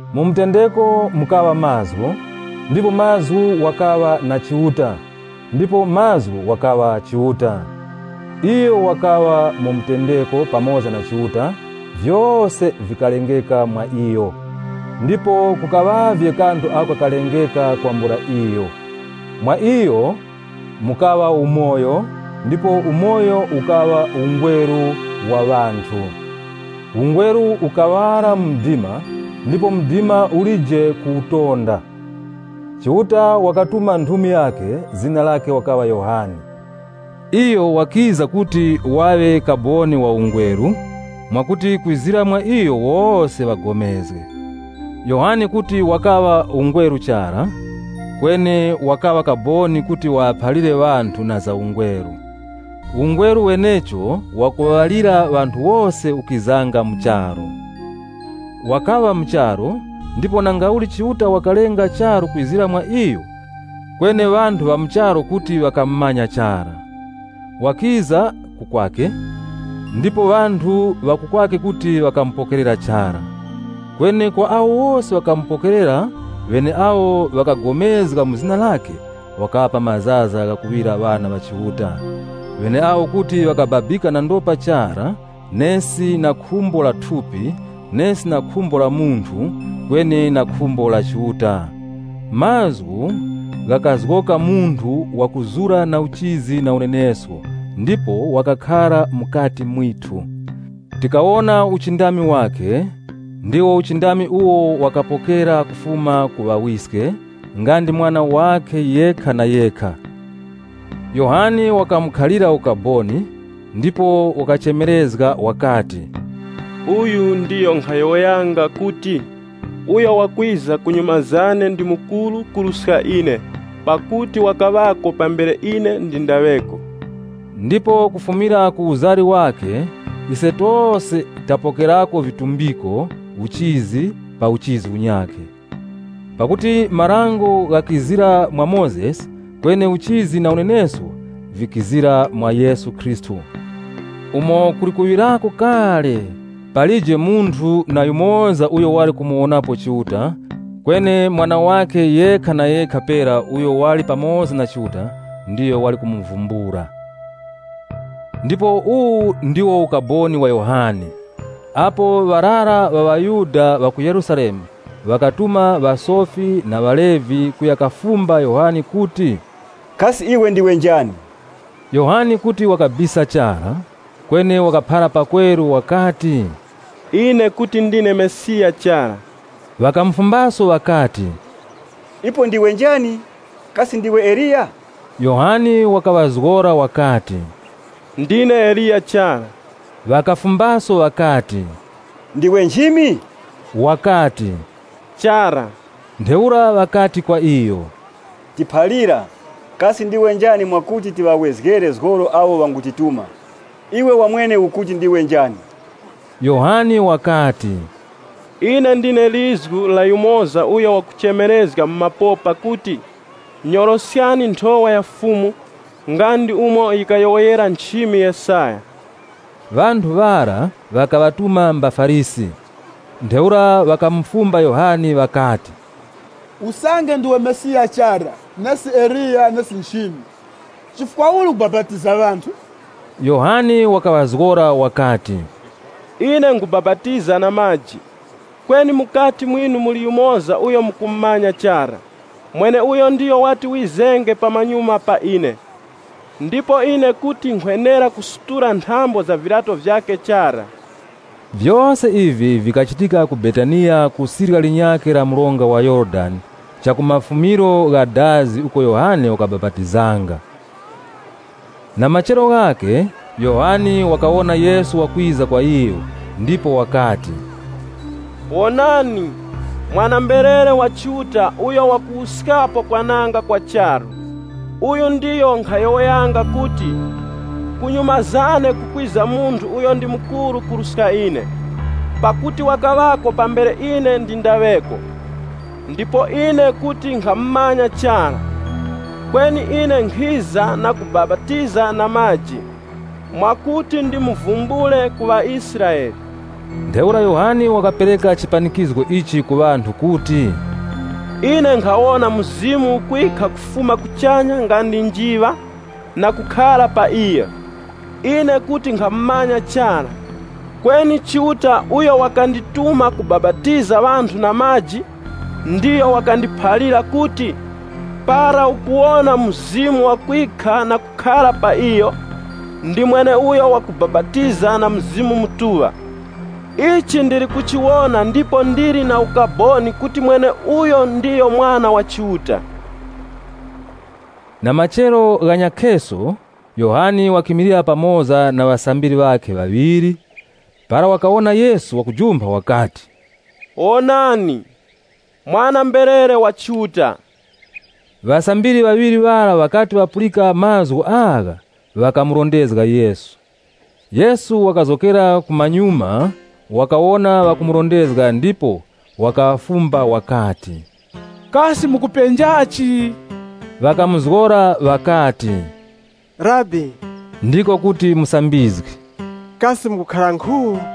Mu mutendeko mukaŵa Mazgu, ndipo Mazgu wakaŵa na Chiuta, ndipo Mazgu wakaŵa Chiuta. Iyo wakaŵa mu mutendeko pamoza na Chiuta. Vyose vikalengeka mwa iyo. Ndipo kukaŵavye kanthu ako kakalengeka kwambula iyo. Mwa iyo mukaŵa umoyo ndipo umoyo ukaŵa ungweru wa ŵanthu. Ungweru ukuŵala mu mdima, ndipo mdima ulije kuwutonda. Chiuta wakatuma nthumi yakhe, zina lakhe wakaŵa Yohane. Iyo wakiza kuti waŵe kaboni wa ungweru mwakuti, kwizira mwa iyo, wose ŵapulikane. Yohane kuti wakaŵa ungweru chara, kweni wakaŵa kaboni kuti waŵaphalire ŵanthu na za ungweru. Ungweru wenecho, wakuŵalira ŵanthu wose, ukizanga mu charu. Wakaŵa mu charu, ndipo nangauli Chiuta wakalenga charu kwizira mwa iyo, kweni ŵanthu ŵa mu charu kuti ŵakamumanya chara. Wakiza ku kwakhe, ndipo ŵanthu ŵa ku kwakhe kuti ŵakamupokerera chara. Kweni kwa wose awo ŵakamupokerera, ŵeneawo ŵakapulikana mu zina lakhe, wakaŵapa mazaza ghakuŵira ŵana ŵa Chiuta, ŵeneawo kuti ŵakababika na ndopa chara nesi na khumbo la thupi, nesi na khumbo la munthu, kweni na khumbo la Chiuta. Mazgu ghakazgoka munthu wakuzura na uchizi na unenesko ndipo wakakhara mukati mwithu. Tikawona uchindami wakhe, ndiwo uchindami uwo wakapokera kufuma ku Ŵawiske nga ndi Mwana wakhe yekha na yekha. Yohane wakamukhalira ukaboni, ndipo wakachemerezga wakati, “Uyu ndiyo nkhayowoyanga kuti, ‘Uyo wakwiza kunyuma zane, ndi mukuru kuruska ine. Pakuti wakaŵako pambere ine ndindaŵeko.’” Ndipo kufumira ku uzari wakhe, ise tose tapokerako vitumbiko, uchizi pa uchizi unyakhe. Pakuti Dango likizira mwa Mozesi, kweni uchizi na unenesko, vikizira mwa Yesu Khristu. Umo kuli kuŵirako kale, palije munthu na yumoza uyo wali kumuwonapo Chiuta, kweni Mwana wakhe yekha na yekha pera uyo wali pamoza na Chiuta, ndiyo wali kumuvumbula. Ndipo uwu ndiwo ukaboni wa Yohane, apo ŵarara ŵa ŵaYuda ŵa ku Yerusalemu ŵakatuma ŵasofi na ŵaLevi kuya kafumba Yohane kuti, “Kasi iwe ndiwe njani?” Yohane kuti wakabisa chara, kweni wakaphara pakweru wakati, “Ine kuti ndine Mesiya chara.” Ŵakamufumbaso ŵakati, “Ipo ndiwe njani? Kasi ndiwe Eliya?” Yohane wakaŵazgora wakati, “Ndine Eliya chara.” Ŵakafumbaso ŵakati, “Ndiwe nchimi?” Wakati, “Chara.” Ntheura ŵakati kwa iyo, “Tiphalira, kasi ndiwe njani mwakuti tiŵawezgere zgoro awo ŵangutituma. Iwe wamwene ukuti ndiwe njani?” Yohane wakati: “Ine ndine lizgu la yumoza uyo wakuchemerezga mu mapopa kuti, ‘Nyoroskani nthowa ya Fumu’” nga ndi umo yikayowoyera nchimi Yesaya. (LXX) Ŵanthu ŵara ŵakaŵatuma mbaFarisi. Ntheura ŵakamufumba Yohane ŵakati, “Usange ndiwe Mesiya chara, nesi Eliya, nesi nchimi, chifukwa uli ukubapatiza ŵanthu?” Yohane wakaŵazgora wakati, “Ine nkhubapatiza na maji, kweni mukati mwinu muli yumoza uyo mukumumanya chara, mweneuyo ndiyo wati wizenge pamanyuma pa ine, ndipo ine kuti nkhwenera kusutula nthambo za viryato vyakhe chara.” Vyose ivi vikachitika ku Betaniya ku sirya linyakhe la mronga wa Yorodani uko Yohane wakabapatizanga. Na machero ghakhe Yohane wakawona Yesu wakwiza kwa iyo, ndipo wakati, “Wonani, Mwana-mberere wa Chiuta uyo wakuwuskapo kwananga kwa charu. Uyu ndiyo nkhayowoyanga kuti, ‘Kunyuma zane kukwiza munthu uyo ndi mukuru kuruska ine, pakuti wakaŵako pambere ine ndindaŵeko.’ Ndipo ine kuti nkhamumanya chara, kweni ine nkhiza na kubapatiza na maji, mwakuti ndimuvumbule ku ŵaIsraele.” Ntheura Yohane wakapereka chipanikizgo ichi ku ŵanthu kuti, “Ine nkhawona Mzimu ukwikha kufuma kuchanya nga ndi njiŵa na kukhara pa iyo. Ine kuti nkhamumanya chara, kweni Chiuta uyo wakandituma kubapatiza ŵanthu na maji, ndiyo wakandiphalira kuti, ‘Para ukuwona Mzimu wakwikha na kukhara pa iyo, ndi mweneuyo wakubapatiza na Mzimu Mutuŵa.’ Ichi ndili kuchiwona ndipo ndili na ukaboni kuti mweneuyo ndiyo Mwana wa Chiuta.” Na machero ghanyakhe Yohane wakimilira pamoza na ŵasambiri ŵakhe ŵaŵiri. Para wakawona Yesu wakujumpha wakati, “Wonani, Mwana-mberere wa Chiuta.” Ŵasambiri ŵaŵiri ŵara ŵakati ŵapulika mazgu agha, ŵakamurondezga Yesu. Yesu wakazgokera kumanyuma, wakawona ŵakumurondezga ndipo wakaŵafumba wakati, “Kasi mukupenja vichi?” Ŵakamuzgora ŵakati, “Rabi, (Ndiko kuti Musambizgi), kasi mukukhara nkhu?”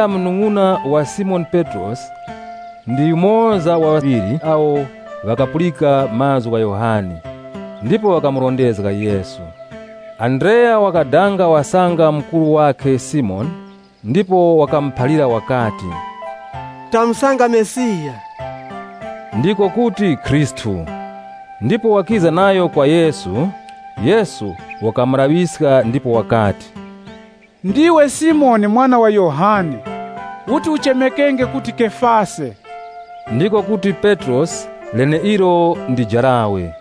Andreya munung'una wa Simoni Petrosi ndi yumoza wa ŵaŵiri awo ŵakapulika mazgu gha Yohane, ndipo ŵakamurondezga Yesu. Andreya wakadanga wasanga mukuru wakhe Simoni, ndipo wakamuphalira wakati, “Tamusanga Mesiya.” (Ndiko kuti “Khristu.”) Ndipo wakiza nayo kwa Yesu. Yesu wakamulaŵiska ndipo wakati, “Iwe ndiwe Simoni mwana wa Yohane. Uti uchemekenge kuti Kefase.” (Ndiko kuti Petrosi, leneilo ndi jarawe.)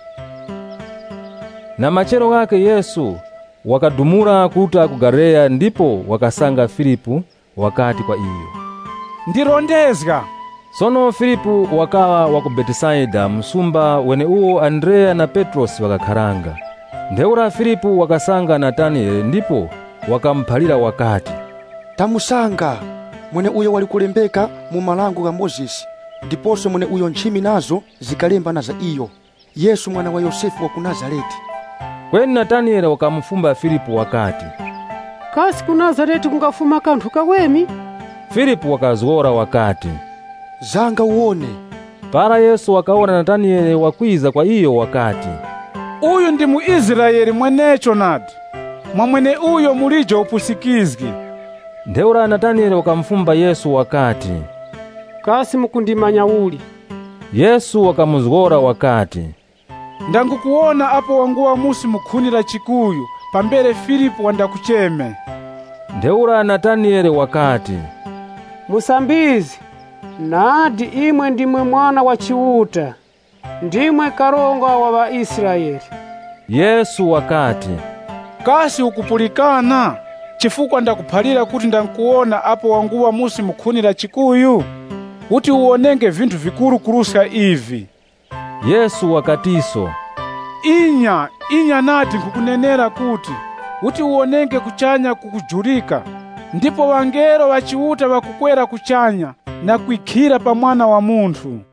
Na machero ghakhe Yesu wakadumula kuruta ku Galileya ndipo wakasanga Filipu, wakati kwa iyo, “Ndirondezga.” Sono Filipu wakaŵa wa ku Betesaida msumba weneuwo Andreya na Petrosi ŵakakharanga. Ntheura Filipu wakasanga Nataniyele ndipo wakamuphalira wakati, “Tamusanga mweneuyo wali kulembeka mu Dango la Mozesi ndiposo mweneuyo nchimi nazo zikalemba na za iyo, Yesu mwana wa Yosefe wa ku Nazarete.” Kweni Nataniyele wakafumba Filipu wakati, “Kasi ku Nazarete kungafuma kanthu kaweme?” Filipu wakazgora wakati, “Zanga uwone.” Para Yesu wakawona Nataniyele wakwiza kwa iyo wakati, “Uyu ndi mu Israele mwenecho nadi, mwa mweneuyo mulije upusikizgi.” Ntheura Nataniyele wakamufumba Yesu wakati, “Kasi mukundimanya uli?” Yesu wakamuzgora wakati, “Ndangukuwona apo wanguŵa musi mu khuni la chikuyu pambere Filipu wandakucheme.” Ntheura Nataniyele wakati, “Musambizgi, nadi imwe ndimwe Mwana wa Chiuta! Ndimwe Karonga wa ŵaIsraele.” Yesu wakati, “Kasi ukupulikana chifukwa ndakuphalira kuti ndangukuwona apo wanguŵa musi mu khuni la chikuyu? Uti uwonenge vinthu vikuru kuruska ivi!” Yesu wakatiso, “Inya, inya nadi nkhukunenera kuti, uti uwonenge kuchanya kukujurika ndipo ŵangelo ŵa Chiuta ŵakukwera kuchanya na kwikhira pa Mwana wa Munthu.”